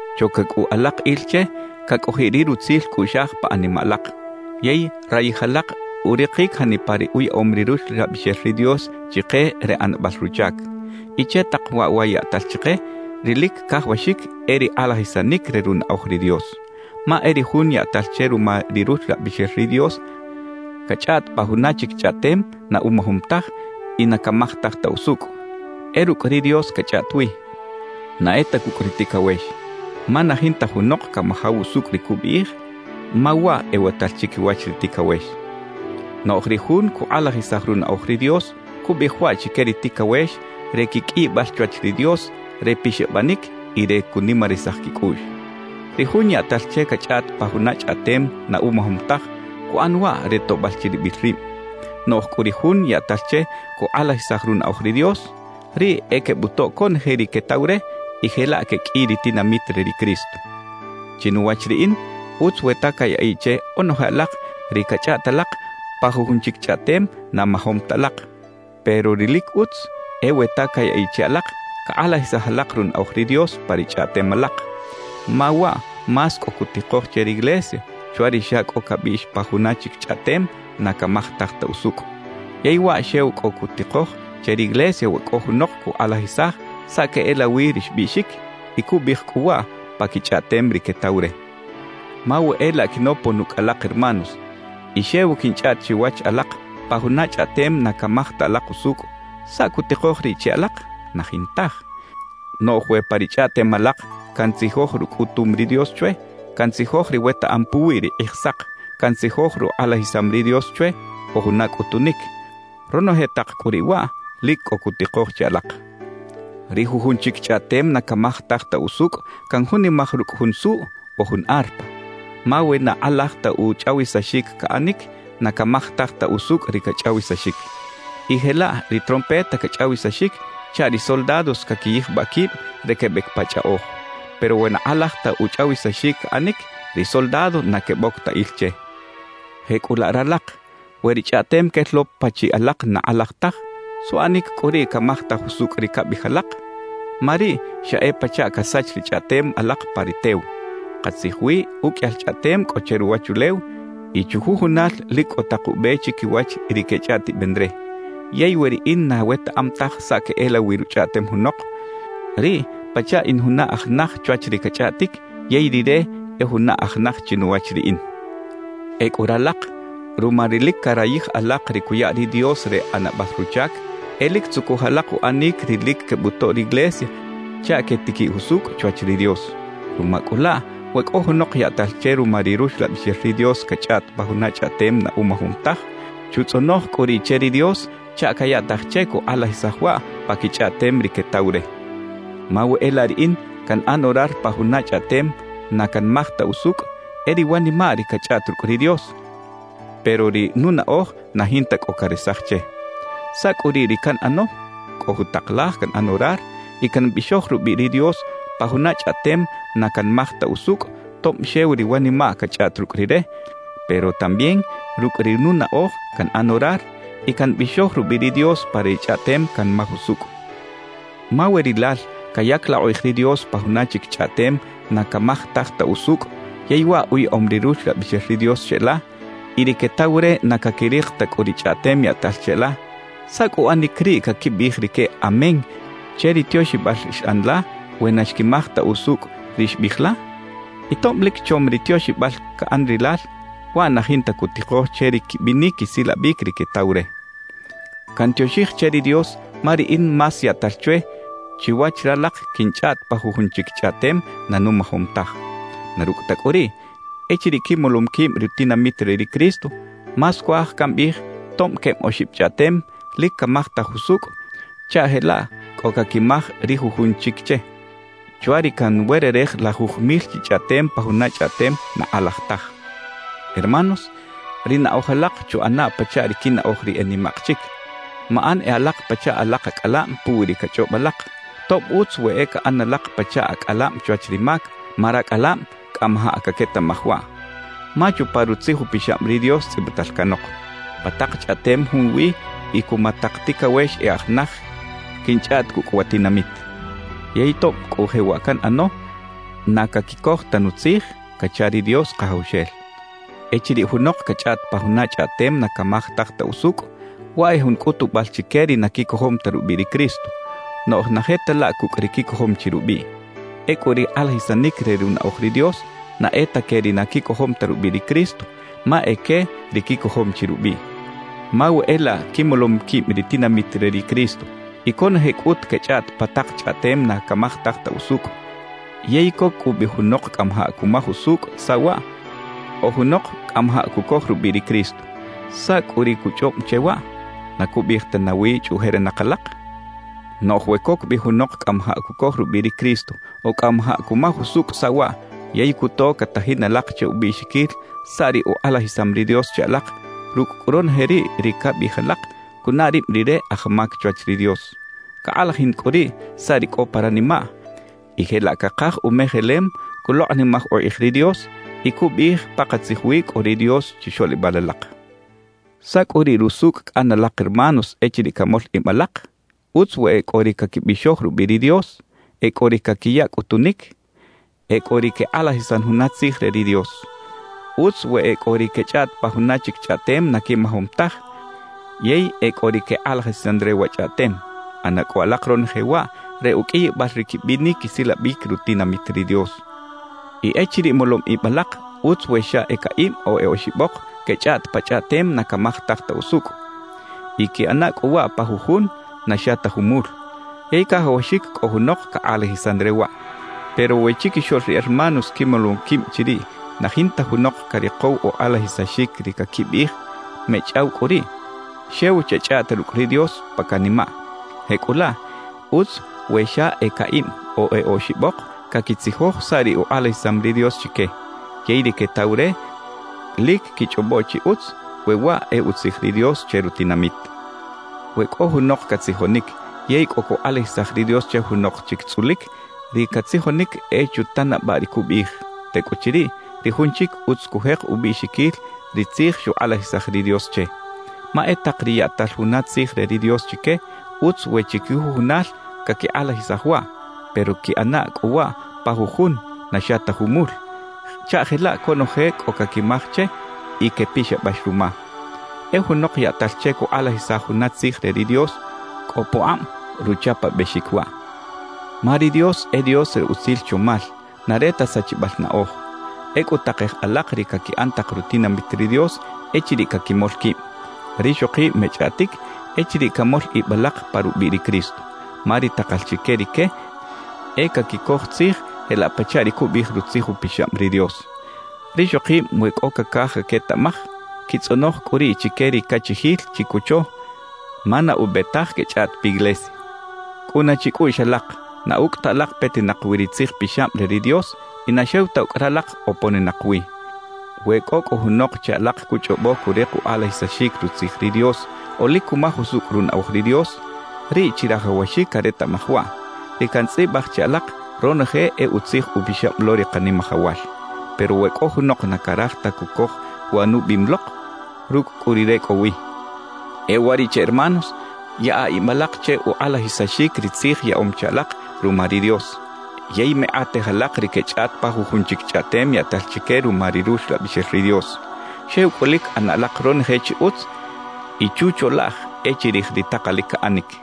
Choca cꞌu alak il che cacꞌojiꞌ ri rutzil cꞌuꞌxaj pa animaꞌ alak, yey rayij alak urikic janipa ri uyaꞌom ri Ruxlabixel ri Dios chike re ꞌanabal ruchac. Y che tak waꞌ wa yaꞌtal chike, ri lic cajawaxic e ri kꞌalajisanic re runaꞌoj ri Dios. Ma e ri jun yaꞌtal che ruma ri Ruxlabixel ri Dios cachꞌaꞌt pa juna chic chꞌaꞌtem na umajom taj y na camajtaj ta usucꞌ, e rucꞌ ri Dios cachꞌaꞌt wi, na e ta cucꞌ ri ticawex. Ma na jinta junok camajaw usucꞌ ri cubiꞌij, ma waꞌ ewatal chiquiwach ri ticawex. Noꞌj ri jun cukꞌalajisaj runaꞌoj ri Dios, cubiꞌij waꞌ chique ri ticawex re quiqꞌuiyibal chwach ri Dios, re pixabanic y re cunimarisaj quicꞌuꞌx. Ri jun yaꞌtal che cachꞌaꞌt pa juna chꞌaꞌtem na umajom taj, cuꞌan waꞌ re toꞌbal chiribil rib. Noꞌj cꞌu ri jun yaꞌtal che cukꞌalajisaj runaꞌoj ri Dios, riꞌ e quebutoꞌ conoje ri quetaw re y jelaꞌ queqꞌuiy ri tinamit re ri Cristo. Chinuwach riꞌin utz we ta cayaꞌiꞌ che onoje alak ri cachꞌaꞌt alak pa jujun chic chꞌaꞌtem na majom ta alak, pero ri lic utz e we ta cayaꞌiꞌ che alak cakꞌalajisaj alak runaꞌoj ri Dios pa ri chꞌaꞌtem alak. Ma waꞌ más cꞌo cutikoj che riglesia chwa ri xa cꞌo cabiꞌx pa juna chic chꞌaꞌtem na camajtaj ta usucꞌ. Yey waꞌ xew cꞌo cutikoj che riglesia we cꞌo junok cukꞌalajisaj saꞌ queꞌelawi ri xbiꞌxic, y cubiꞌij cꞌu waꞌ pa quichꞌaꞌtem ri quetaw re. Ma we e laꞌ quinopon ucꞌ alak hermanos y xew quinchꞌaꞌt chiwach alak pa juna chꞌaꞌtem na camaj ta alak usucꞌ, ¿saꞌ cutikoj riꞌ che alak? Na jintaj. Noꞌj we pa ri chꞌaꞌtem alak cantzijoj rucꞌutum ri Dios chwe, cantzijoj ri wetaꞌam puwi ri Kꞌijsak, cantzijoj rukꞌalajisam ri Dios chwe o juna cꞌutunic, ronoje tak cꞌu riꞌ waꞌ lic cꞌo cutikoj che alak. Ri jujun chic chꞌaꞌtem na camajtaj ta usucꞌ canjunimaj rucꞌ jun suꞌ o jun arpa; ma we na kꞌalaj ta uchꞌawisaxic caꞌanic, na camajtaj ta usucꞌ ri cachꞌawisaxic. Y jelaꞌ ri trompeta cachꞌawisaxic chaꞌ ri soldados caquiyijbaꞌ quib re quebec pa chꞌaꞌoj. Pero we na kꞌalaj ta uchꞌawisaxic caꞌanic, ri soldados na queboc ta il che. Jecꞌulaꞌ ralak, we ri chꞌaꞌtem quel lo pachiꞌ alak na kꞌalaj taj, ¿suꞌanic cꞌu riꞌ camajtaj usucꞌ ri cabiꞌij alak? Ma riꞌ xa e pachaꞌ casach ri chꞌaꞌtem alak pa ri tew. Katzij wi uqꞌuiyal chꞌaꞌtem cꞌo che ruwachulew y chujujunal lic cꞌo tak ube chiquiwach ri quechꞌaꞌtiben re. Yey we riꞌin na wetaꞌam taj saꞌ queꞌelawi ruchꞌaꞌtem junok, riꞌ pachaꞌ in juna aj naj chwach ri cachꞌaꞌtic yey rire e juna aj naj chinuwach riꞌin. Ecꞌu ralak, ruma ri lic carayij alak ri cuya ri Dios re ꞌanabal ruchac, e lic tzucuj alak uꞌanic ri lic quebutoꞌ riglesia chaꞌ quetiquiꞌ jusucꞌ chwach ri Dios. Ruma cꞌu laꞌ we cꞌo junok yaꞌtal che ruma ri Ruxlabixel ri Dios cachꞌaꞌt pa juna chꞌaꞌtem na umajom taj, chutzꞌonoj cꞌu riꞌ che ri Dios chaꞌ cayaꞌtaj che cukꞌalajisaj waꞌ pa quichꞌaꞌtem ri quetaw re. Ma we e laꞌ riꞌin canꞌan orar pa juna chꞌaꞌtem na canmaj ta usucꞌ, e ri wanimaꞌ ri cachꞌaꞌt rucꞌ ri Dios, pero ri nunaꞌoj na jinta cꞌo caresaj che. ¿Saꞌ cꞌu riꞌ ri canꞌano? Cꞌo jutak laj canꞌan orar y cambixoj rubiꞌ ri Dios pa juna chꞌaꞌtem na canmaj ta usucꞌ tob xew ri wanimaꞌ cachꞌaꞌt rucꞌ Rire, pero también rucꞌ ri nunaꞌoj canꞌan orar y cambixoj rubiꞌ ri Dios pa ri chꞌaꞌtem canmaj usucꞌ. Ma we rilal cayac la ukꞌij ri Dios pa juna chic chꞌaꞌtem na camajtaj ta usucꞌ yey waꞌ uyaꞌom ri Ruxlabixel ri Dios cheꞌla, y ri quetaw re na caquirik ta cꞌu ri chꞌaꞌtem yaꞌtal cheꞌla, ¿saꞌ cꞌu uꞌanic riꞌ caquibiꞌij rique «Amén» che ri tioxibal xꞌan la we na xquimaj ta usucꞌ ri xbiꞌij la? Y tob lic chom ri tioxibal caꞌan rilal, waꞌ na jinta cutikoj che ri quibinic quisilabic ri quetaw re. Cantioxij che ri Dios ma riꞌin más yaꞌtal chwe chiwach ralak quinchꞌaꞌt pa jujun chic chꞌaꞌtem na numajom taj. Na rucꞌ ta cꞌu riꞌ, echiriꞌ quimolom quib ri tinamit re ri Cristo, más cuaj cambiꞌij tob queb oxib chꞌaꞌtem lic camajtaj usucꞌ chaꞌ jelaꞌ cꞌo caquimaj ri jujun chic che, chwa ri canwererej lajuj mil chi chꞌaꞌtem pa juna chꞌaꞌtem na kꞌalaj taj. Hermanos, ri naꞌoj alak chuꞌana pachaꞌ ri quinaꞌoj ri e nimaꞌk chic. Maꞌan e alak pachaꞌ alak acꞌalab puwi ri cachꞌob alak, tob utz we e caꞌan alak pachaꞌ acꞌalab chwach ri mac, ma racꞌalab cꞌamajaꞌ caquetaꞌmaj waꞌ. Ma chupa Rutzij Upixab ri Dios tzꞌibital canok: Pa tak chꞌaꞌtem junwi y cuma tak ticawex e aj naj quinchꞌaꞌt cucꞌ wa tinamit. Yey tob cꞌu jewaꞌ canꞌano, na caquicoj ta nutzij cacha ri Dios Kajawxel. Echiriꞌ junok cachꞌaꞌt pa juna chꞌaꞌtem na camajtaj ta usucꞌ, waꞌ e jun cꞌutubal chique ri na quicojom ta rubiꞌ ri Cristo; noꞌj na je ta laꞌ cucꞌ ri quicojom chi rubiꞌ. Ecꞌu ri kꞌalajisanic re runaꞌoj ri Dios, na e ta que ri na quicojom ta rubiꞌ ri Cristo, ma e que ri quicojom chi rubiꞌ. Ma we e laꞌ quimolom quib ri tinamit re ri Cristo y conoje cꞌut quechꞌaꞌt pa tak chꞌaꞌtem na camajtaj ta usucꞌ, yey coc cꞌu bi junok cꞌamajaꞌ cumaj usucꞌ saꞌ waꞌ o junok cꞌamajaꞌ cucoj rubiꞌ ri Cristo, ¿saꞌ cꞌu ri cuchꞌob che waꞌ? ¿Na cubiꞌij ta nawi chꞌuꞌjerinak alak? Noꞌj we coc bi junok cꞌamajaꞌ cucoj rubiꞌ ri Cristo o cꞌamajaꞌ cumaj usucꞌ saꞌ waꞌ yey cuto catajin alak che ubiꞌxiquil saꞌ ri ukꞌalajisam ri Dios che alak; rucꞌ cꞌu ronoje riꞌ ri cabiꞌij alak, cunaꞌ rib rire aj mac chwach ri Dios. Cakꞌalajin cꞌu riꞌ saꞌ ri cꞌo pa ranimaꞌ y jelaꞌ cakaj umejelem, culokꞌnimaj ukꞌij ri Dios y cubiꞌij pakatzij wi cꞌo ri Dios chixoꞌlibal alak. ¿Saꞌ cꞌu riꞌ rusucꞌ caꞌan alak hermanos echiriꞌ camol ib alak? Utz we e cꞌo ri caquibixoj rubiꞌ ri Dios, e cꞌo ri caquiya cꞌutunic, e cꞌo ri quekꞌalajisan juna tzij re ri Dios. Utz we e cꞌo ri quechꞌaꞌt pa juna chic chꞌaꞌtem na quimajom taj yey e cꞌo ri quekꞌalajisan re wa chꞌaꞌtem. ꞌAna cꞌu alak ronoje waꞌ re uqꞌuiyibal ri quibinic quisilabic rutinamit ri Dios. Y echiriꞌ molom ib alak, utz we xa e caꞌib o e oxibok quechꞌaꞌt pa chꞌaꞌtem na camajtaj ta usucꞌ; y quiꞌana cꞌu waꞌ pa jujun, na xa ta jumul. Yey cajawaxic cꞌo junok cakꞌalajisan re waꞌ. Pero we chiquixoꞌl ri hermanos quimolom quib chiriꞌ na jinta junok carikow ukꞌalajisaxic ri caquibiꞌij, mechꞌaw cꞌu riꞌ; xew chechꞌaꞌta rucꞌ ri Dios pa canimaꞌ. Jecꞌulaꞌ, utz we xa e caꞌib o e oxibok caquitzijoj saꞌ ri ukꞌalajisam ri Dios chique. Yey ri quetaw re lic quichꞌobo chi utz, we waꞌ e utzij ri Dios che rutinamit. We cꞌo junok catzijonic yey cꞌo cukꞌalajisaj ri Dios che junok chic tzꞌulic, ri catzijonic e chutanabaꞌ ri cubiꞌij; tecꞌuchiriꞌ, ri jun chic utz cujek ubiꞌxiquil ri tzij xukꞌalajisaj ri Dios che. Ma e tak ri yaꞌtal juna tzij re ri Dios chique, utz we chiquijujunal caquikꞌalajisaj waꞌ, pero quiꞌana cꞌu waꞌ pa jujun, na xa ta jumul, chaꞌ jelaꞌ conoje cꞌo caquimaj che y quepixabax ruma. E junok yaꞌtal che cukꞌalajisaj juna tzij re ri Dios, cꞌo pukꞌab ruchapabexic waꞌ. Ma ri Dios e Dios re utzil chomal, na re ta sachibal naꞌoj. Ecꞌu takej alak ri caquiꞌan tak rutinamit ri Dios echiriꞌ caquimol quib. Rixokib mechꞌaꞌtic echiriꞌ camol ib alak pa rubiꞌ ri Cristo. Ma ri takal chique rique e caquicoj tzij jelaꞌ pachaꞌ ri cubiꞌij Rutzij Upixab ri Dios. Rixokib we cꞌo cacaj caquetaꞌmaj, quitzꞌonoj cꞌu riꞌ chique ri cachijil chicocho, ma na ube taj quechꞌaꞌt piglesia. Cꞌuna chicꞌuꞌx alak, na ucꞌ ta alak petinak wi ri Tzij Pixab re ri Dios y na xew ta ucꞌ ralak oponinak wi. We cꞌo cꞌu junok che alak cuchꞌobo curik ukꞌalajisaxic Rutzij ri Dios o lic cumaj usucꞌ runaꞌoj ri Dios, riꞌ chirajawaxic caretaꞌmaj waꞌ: Ri cantzꞌibaj che alak, ronoje e Utzij Upixab lo ri Kanimajawal. Pero we cꞌo junok na caraj ta cucoj wa nubiꞌim lok, rucꞌ cꞌu rire cꞌo wi. E uwariꞌche hermanos, yaꞌa ib alak che ukꞌalajisaxic ri tzij yaꞌom che alak ruma ri Dios. Yey mekꞌatej alak ri quechꞌaꞌt pa jujun chic chꞌaꞌtem yaꞌtal chique ruma ri Ruxlabixel ri Dios. Xew cꞌu lic ꞌana alak ronoje chi utz y chucholaꞌj e chirij ri takalic caꞌanic.